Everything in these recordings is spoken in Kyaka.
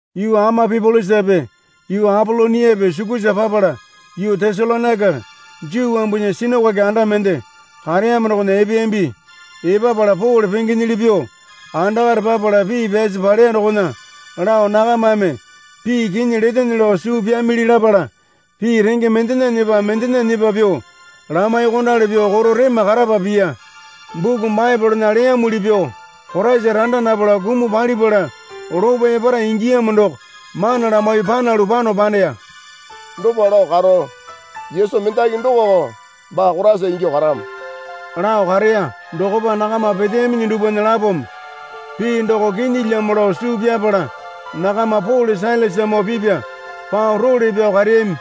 Yuu Amapipolisape yuu Apoloniape sukusa papala yuu Tesalonaika Juu wambunya sinakoke anda mende kareyamo dokona epeyambi. Epapala Pole pengenyili pyuo andakare papala pii pyasi paleya dokona lao nakamame pii kinyi letene lao suu pyamili lapala pii renge mendena nyepa mendena nyepa pyuo lamaiyuokondali pyuo koro rema karapa piya. Buku Baepolena leyamuli pyuo Koraisa randa napala kumuo palipala lopo epara ingiyamo doko mana lamaiyuo panalu pano paneya. Dopa lao karo Yesu mendaki dokoko baa Koraisa ingyuo karamo lao kareya. Dokopa nakama peteyaminyi dupwana lapome pii doko kinyilyamo lao suu pyapala nakama Pole Sailasamoo pipya pao role pyao kareyami.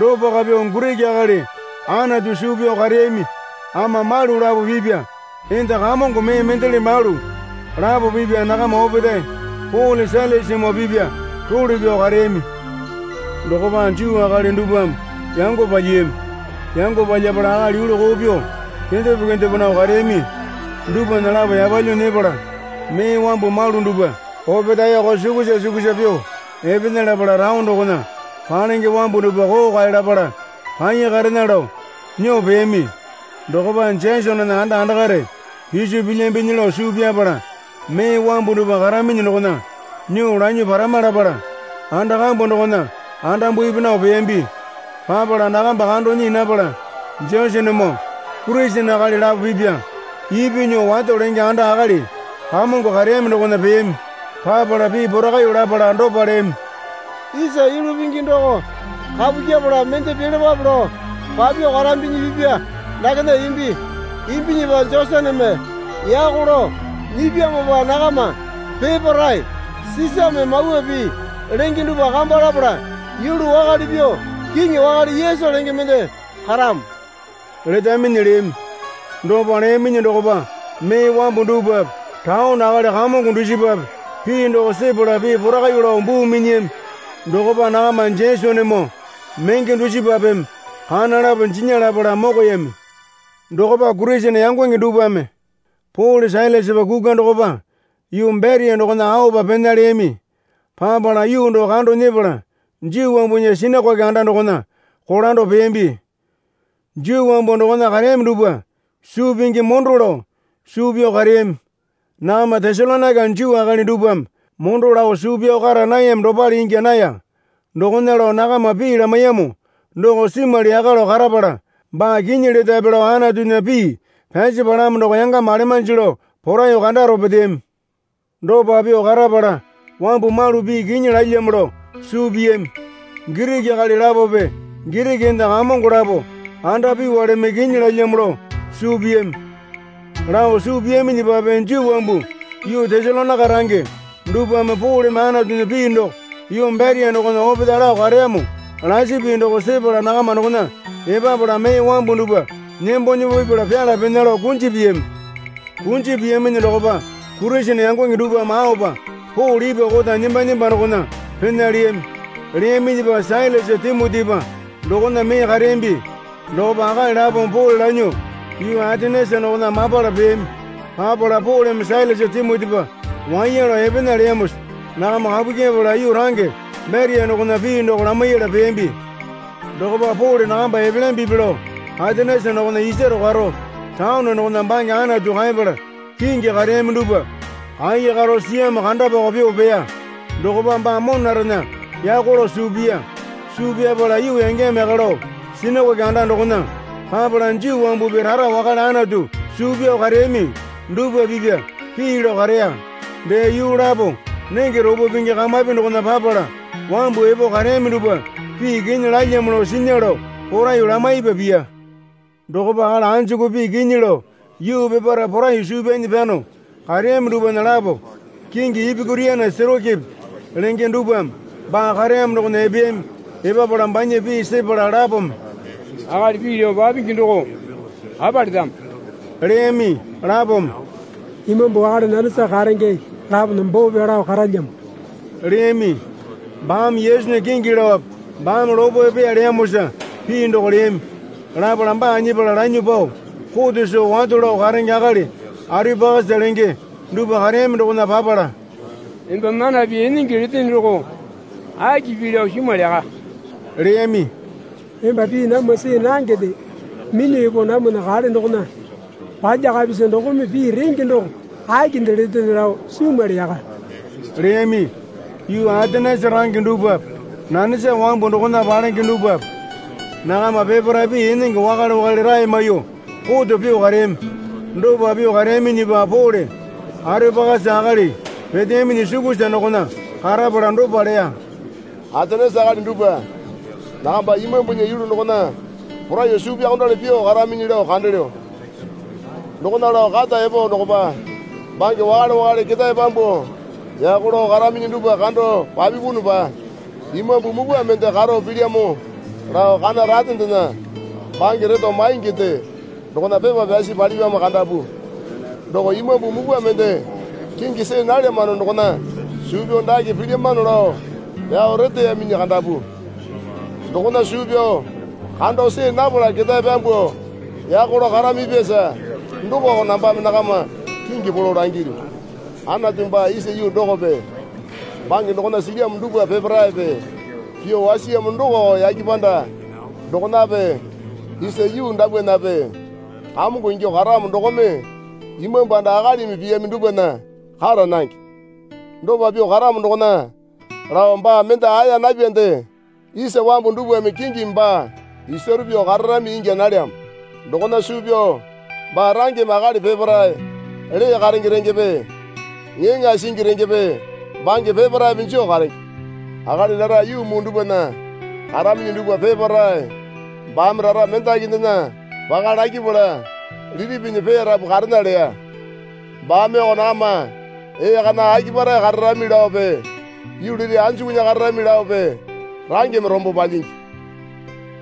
Dopako pyuo Giriki akali Anatu suu pyao kareyami ama malu lapo pipya enda kamongo mee mendele malu lapo pipya nakama opetae Pole Sailasamoo pipya role pyao kareyami. Dokopa Juu akali dupwame yango palyiyami. Yango palyapala akali yulu koo pyuo kendepo kendepo nao kareyami dupwana lapo yapalyuo nyepala mee wambu malu dupwa opetaeko sukusa sukusa pyuo epena lapala taone dokona palenge wambu dupwa kookae lapala kaiya karena lao nyuo peyami. Dokopa Jesonena anda andakare piso pilyambinyi lao suu pyapala mee wambu dupwa karaminyi dokona nyuo lanyuo parama lapala anda kambu dokona andambupi nao peyambi. Papala nakamba kando nyii napala Jesonemoo Kurisene akali lapo pipya ipyuo nyuo wato lenge anda akali kamongo kareyami dokona peyami. Papala pii porakaiyuo lapala dopa leyami. Isa yulu pingi doko kapu kyepala mende pilapape lao papyuo karambinyi pipa dakena imbi. Imbinyipa Jesoneme yako lao nyipyamopa nakama peparae Sisame mawa pii lenge dupwa kamba lapala yulu wakale pyuo kiŋi wakale Yesu lenge mende karamo letaminyi leyami. Dopa leyaminyi dokopa mee wambu dupwape taone akali kamongo dusipape pii doko sepala pii porakaiyuo lao buu minyiyami. Dokopa nakama Jesonemoo menge dusipapeme kana lapo jinya lapala mokoyami. Dokopa Kurisene yangonge dupwame Pole Sailasapa kukwa dokopa yuu Beria dokona aopa pena leyami. Papala yuu doko kando nyepala Juu wambunya sinakoke anda dokona kolando peyambi. Juu wambu dokona kareyami dupwa suu pingi mondo lao suu pyao kareyami. Nakama Tesalonaika Juu akali dupwame mondo lao suu pyao kara nayami dopale ingya naya. Dokona lao nakama pii lamaiyamo doko simwali yaka lao karapala baa kinyi letape lao Anatunya pii pyasi palamo doko yangama alemanji lao poraiyuo kandaro peteyami. Dopa pyuo karapala wambu malu pii kinyi lalyamo lao suu piyami. Giriki akali lapope Giriki enda kamongo lapo andapyuwaleme kinyi lalyamo lao suu piyami. Lao suu piyaminyipape Juu wambu yuu Tesalonaika range dupwame Poleme Anatunya pii doko yuu Beria dokona opetae lao kareyamo lasi pii doko sepala nakama dokona epapala mee wambu dupwa nembo nembo pipala pyala pena lao kunji piyami. Kunji piyaminyi dokopa Kurisene yangonge dupwame aopa Pole ipwa kota nemba nemba dokona pena leyami. Leyaminyipa Sailasa Timotipa dokona mee kareyambi. Dokopa akali lapome Pole lanyuo yuu Atenesa dokona mapala peyami. Papala Poleme Sailasa Timotipa waiya lao epena leyamosa nakama kapu kyepala yuu range Beria dokona pii doko lamaiyala peyambi. Dokopa Pole nakamba epelyambipi lao Atenesa dokona isaro karo taone dokona bange Anatu kaepala kingi kareyami dupwa kaiya karo siyamo kandapako pyuo peya. Dokopa baa monarena yako lao suu piya. Suu pyapala yuu yangeyamo yaka lao sinakoke anda dokona papala Juu wambupi rara wakale Anatu suu pyao kareyami dupwape pipya pii lao kareya. Dee yuu lapo nenge ropo pingi kamapi dokona papala wambu epo kareyami dupwa pii kinyi lalyamo lao sinya lao poraiyuo lamaipa piya. Dokopa akali anjuku pii kinyi lao yuu peparae poraiyuo suu pyanyi pyano kareyami dupwana lapo kingi Epikuriana Setoikipi lenge dupwame baa kareyamo dokona epeyami. Epapala banya pii sepala lapome, Akali pii lao papingi doko apa letamo? leyami. Lapome, Imambu wakale nanesa karenge lapona boo pyao lao karalalyamo, leyami. Baame Yesunya kingi laope baame lopo epeya leyamosa pii doko leyami. Lapala baa nyepala lanyuo pao kote soo wato lao karenge akali Areopakasa lenge dupwa kareyami dokona papala, Emba mana pii enenge letene doko aki pii lao simwali yaka, leyami. Emba pii namwa see nangende minyuo epo namwana kale dokona palyakapisa dokome pii renge doko akinde letene lao simwali yaka, leyami. (Yuu Atenesa range dupwape nanesa wambu dokona palenge dupwape nakama peparae pii enenge wakale wakale rae maiyuo koto pyuo kareyami.) Dopa pyuo kareyaminyipa Pole Areopakasa akali peteyaminyi sukusa dokona karapala dopa leya. Atenesa akali dupwa, nakama imambunya yulu dokona poraiyuo suu pyaokondali pyuo karaminyi lao kandelyo. Dokona lao kata epo dokopa bange wakale wakale ketae pyambuo yako lao karaminyi dupwa kando papipunupa imambu mupwa mende karo pilyamo lao kana ratendena bange reto mainginde dokona pepa pyasi palipyamo kandapu. Doko imambu mupwa mende kingi see nalyamano dokona suu pyao dake pilyamano lao pyao reteyaminyi kandapu. Dokona suu pyao kando see napala ketae pyambuo yako lao karamipyasa dokoko nambame nakama kingi polo langilyu. Anatu baa isa yuu dokope bange dokona silyamo dupwa peparaepe pyuo wasiyamo dokoko yake panda dokonape isa yuu dapwanape Kamongo ingyuo karamo dokome imambu anda akalimi piyami dupwana kara nange. Dopa pyuo karamo dokona lao baa mende aeya napyande isa wambu dupwame kingimi baa isaro pyuo kararami ingya nalyamo. Dokona suu pyao baa rangeme akali peparae lee karenge rengepe ŋeeŋae singi rengepe bange peparaepe joo karenge. Akali rara yuu muu dupwana karaminyi dupwa peparae baame rara mendakindena paka lakyapala liti pinyi peyarapu karena leya. Baameoko nakama ee kana akipare kararami laope yuu liti anjukunya kararami laope rangeme rombo palyingi.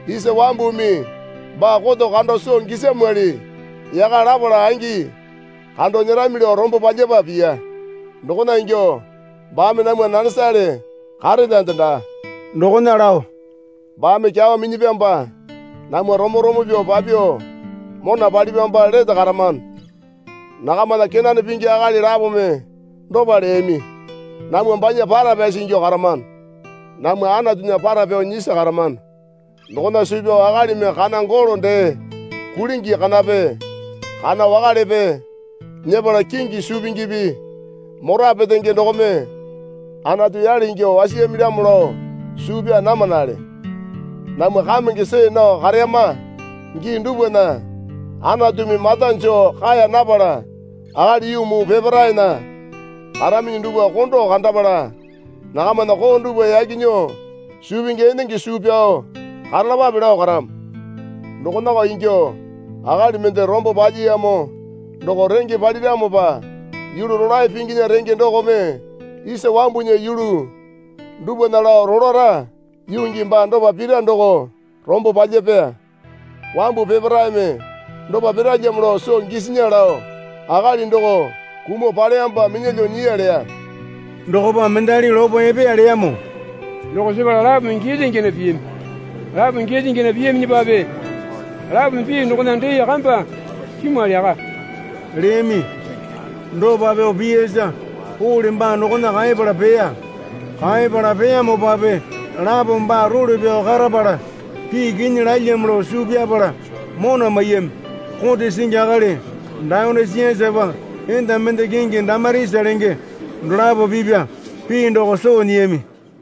Isa wambumi baa koto kando soo gisamwali yaka lapala angi kando nyerami lao rombo palyapa piya. Dokona ingyuo baame namwa nanesale karelyande daa. Dokona lao, Baame kyawa minyapyamopa namwa romo romo pyuo papyuo, mona palipyamopa lete karamano. Nakamana kenane pingi akali lapome dopa leyami, Namwa banya para pyasi ingyuo karamano. Namwa Anatunya para pyao nyisi karamano dokona suu pyao akalimi kana golo dee kulingi kanape kana wakalepe nyepala kingi suu pingipi mora petenge dokome Anatu yale ingyuo wasiyamilyamo lao suu pyaa namanale. Namwa kamenge see nao kareyama gii dupwana Anatumi mata joo kae napala akali yuu muu peparaena karaminyi dupwa kondo kandapala nakamana koo dupwa yaki nyuo suu pingi enenge suu pyao karalapape lao karamo. Dokonako ingyuo akali mende rombo palyiyamo doko renge paliramopa yulu rolae pinginya renge dokome isa wambunya yulu dupwana lao rolara yuu gii baa dopa pira doko rombo palyapeya. Wambu peparaeme dopa piralyamo lao soo gisinya lao akali doko kumuo paleyamopa minyalyuo nyiya leya. Dokopa mendali lopo epeya leyamo doko sepala lapome giyalya giyana piyami. Lapome giyalya giyana piyaminyipape lapome pii dokona dee kamba simwali yaka, leyami. Dopa pyuo piyasa Pole baa dokona kaepala peya. Kaepala peyamopape lapome baa role pyao karapala pii kinyi lalyamo lao suu pyapala mona maiyami. Kote singi akali Dayonisiasapa enda mende kingi Damarisa lenge dolapo pipa pii doko soo nyiyami.